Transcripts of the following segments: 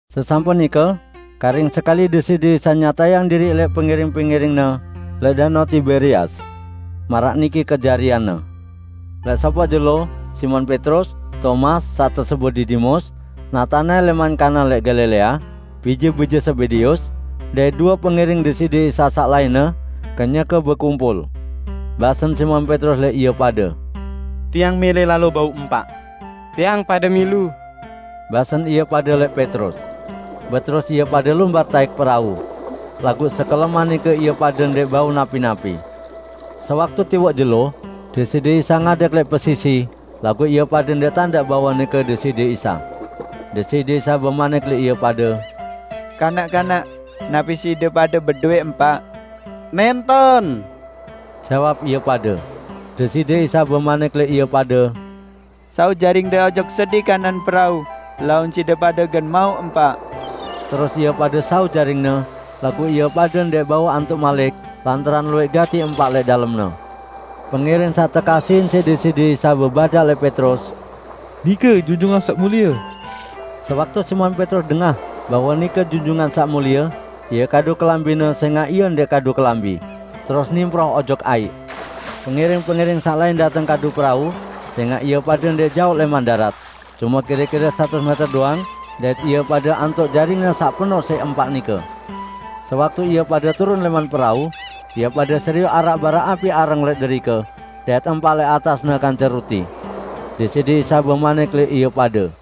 Sesampun nike karing sekali Deside Isa nyatayang diriq lẽq pengiring-pengiring-Ne lẽq Danao Tiberias. Maraq niki kejarianne: Lẽq sopoq jelo Simon Petrus, Tomas saq tesebut Didimus, Natanael lẽman Kana lẽq Galilea, bije-bije Zebedeus, dait due pengiring Deside Isa saq lainne, kenyeke bekumpul. Basen Simon Petrus lẽq ie pade, "Tiang mẽlẽ lalo bau empaq." "Tiang pade milu," basen ie pade lẽq Petrus. Beterus ie pade lumbar taẽk perau. Laguq sekeleman nike ie pade ndẽq bau napi-napi. Sewaktu tiwoq jelo, Deside Isa ngadeg lẽq pesisi, laguq ie pade ndẽq tandaq bahwe nike Deside Isa. Deside Isa bemanik lẽq ie pade, "Kanak-kanak, napi side pade bedowẽ empaq?" "Nẽnten," jawab ie pade. Deside Isa bemanik lẽq ie pade, "Saut jaringde ojok sedi kanan perau, laun side pade gen mauq empaq." Terus ie pade saut jaringne, laguq ie pade ndẽq bau antuq malik lantaran luwẽq gati empaq lẽq dalemne. Pengiring saq tekasihin siq Deside Isa bebadaq lẽq Petrus, "Nike Junjungan Saq Mulie!" Sewaktu Simon Petrus dengah bahwe nike Junjungan Saq Mulie, ie kadu kelambine, sẽngaq ie ndẽq kadu kelambi, terus nimproh ojok aiq. Pengiring-pengiring saq lain dateng kadu perau, sẽngaq ie pade ndẽq jaoq lẽman darat, cume kire-kire satus mẽter doang dait ie pade antuq jaringne saq penoq siq empaq nike. Sewaktu ie pade turun lẽman perau, ie pade serioq araq barak api areng lẽq derike dait empaq lẽq atasne kance ruti. Deside Isa bemanik lẽq ie pade,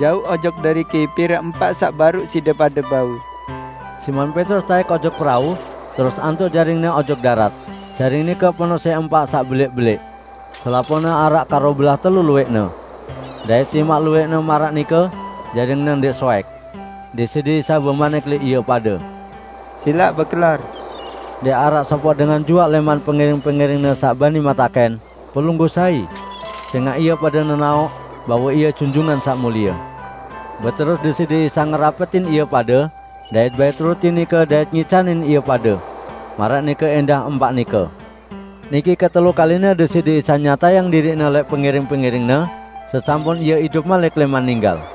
"Jauq ojok deriki pire empaq saq baruq side pade bau." Simon Petrus taẽk ojok perau, terus antuq jaringne ojok darat. Jaring nike penoq siq empaq saq belẽq-belẽq: Selapuqne araq karobelah telu luwẽqne. Dait timaq luwẽqne maraq nike, jaringne ndẽq soẽk. Deside Isa bemanik lẽq ie pade, "Silaq bekelor." Ndẽq araq sopoq dengan juaq lẽman pengiring-pengiring-Ne saq bani metakẽn, "Pelungguh sai?" Sẽngaq ie pade nenaoq bahwe Ie Junjungan Saq Mulie. Beterus Deside Isa ngerapetin ie pade dait bait ruti nike dait ngicanin ie pade, maraq nike ẽndah empaq nike. Niki ketelu kaline Deside Isa nyatayang diriq-Ne lẽq pengiring-pengiring-Ne sesampun Ie idup malik lẽman ninggal.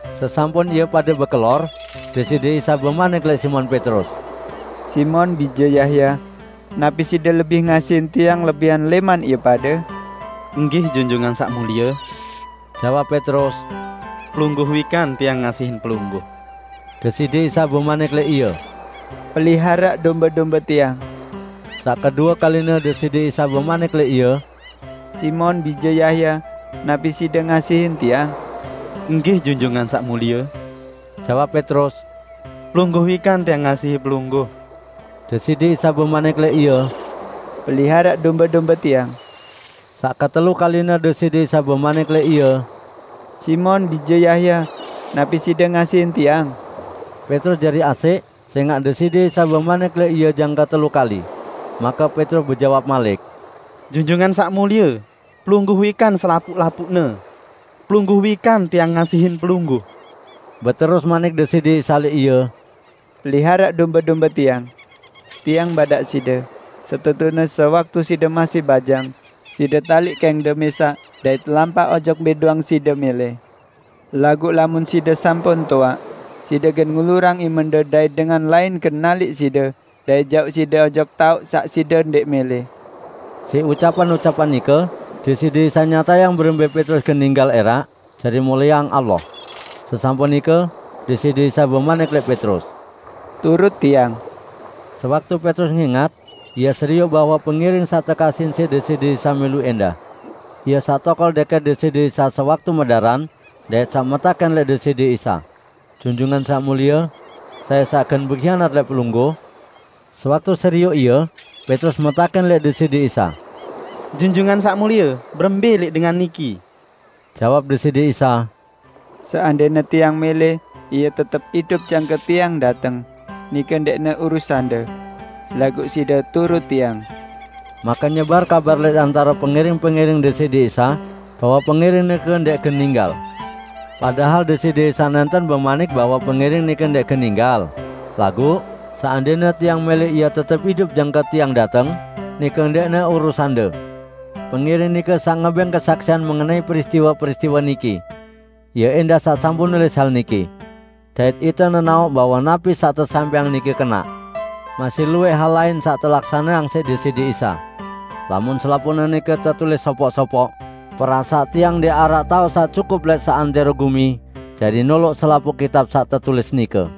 Sesampun ie pade bekelor, Deside Isa bemanik lẽq Simon Petrus, "Simon bije Yahya, napi side lebih ngasihin Tiang lebihan lẽman ie pade?" "Nggih, Junjungan Saq Mulie," jawab Petrus, "Pelungguh wikan tiang ngasihin Pelungguh." Deside Isa bemanik lẽq ie, "Peliharaq dombe-dombe Tiang!" Saq kedue kaline Deside Isa bemanik lẽq ie, "Simon bije Yahya, napi side ngasihin Tiang?" "Nggih, Junjungan Saq Mulie," jawab Petrus, "Pelungguh wikan tiang ngasihin Pelungguh." Deside Isa bemanik lẽq ie, "Peliharaq dombe-dombe Tiang." Saq ketelu kaline Deside Isa bemanik lẽq ie, "Simon bije Yahya, napi side ngasihin Tiang?" Petrus jari asẽq sẽngaq Deside Isa bemanik lẽq ie jangke telu kali. Make Petrus bejawab malik, "Junjungan Saq Mulie, Pelungguh wikan selapuq-lapuqne. Pelungguh wikan tiang ngasihin Pelungguh!" Beterus manik Deside Isa lẽq ie, "Peliharaq dombe-dombe Tiang. Tiang badaq side: Setetune sewaktu side masih bajang, side taliq kẽngde mẽsaq dait lampaq ojok mbẽ doang side mẽlẽ, laguq lamun side sampun toaq, side gen ngulurang imende dait dengan lain gen naliq side dait jauq side ojok taoq saq side ndẽq mẽlẽ." (Siq ucapan-ucapan nike, Deside Isa nyatayang berembẽ Petrus gen ninggal ẽraq jari mulieang Allah.) Sesampun nike Deside Isa bemanik lẽq Petrus, "Turut Tiang!" Sewaktu Petrus ngẽngat, ie serioq bahwe pengiring saq tekasihin siq Deside Isa milu ẽndah. (Ie saq tokol dẽkẽt Deside Isa sewaktu medaran dait saq metakẽn lẽq Deside Isa, "Junjungan Saq Mulie, sai saq gen behianat lẽq Pelungguh?") Sewaktu serioq ie, Petrus metakẽn lẽq Deside Isa, "Junjungan Saq Mulie, berembẽ lẽq dengan niki?" Jawab Deside Isa, "Seandẽne Tiang mẽlẽ ie tetep idup jangke Tiang dateng, nike ndẽqne urusande. Laguq side, turut Tiang!" Make nyebar kabar lẽq antare pengiring-pengiring Deside Isa bahwe pengiring nike ndẽq gen ninggal. Padahal Deside Isa nẽnten bemanik bahwe pengiring nike ndẽq gen ninggal, laguq: "Seandẽne Tiang mẽlẽ ie tetep idup jangke Tiang dateng, nike ndẽqne urusande." Pengiring nike saq ngebẽng kesaksian mengenai peristiwe-peristiwe niki. Ie ẽndah saq sampun nulis hal niki. Dait ite nenaoq bahwe napi saq tesampẽang nike kenaq. Masih luwẽq hal lain saq telaksaneang siq Deside Isa. Lamun selapuqne nike tetulis sopoq-sopoq, perasaq tiang ndẽq araq taoq saq cukup lẽq seantẽro gumi jari noloq selapuq kitab saq tetulis nike.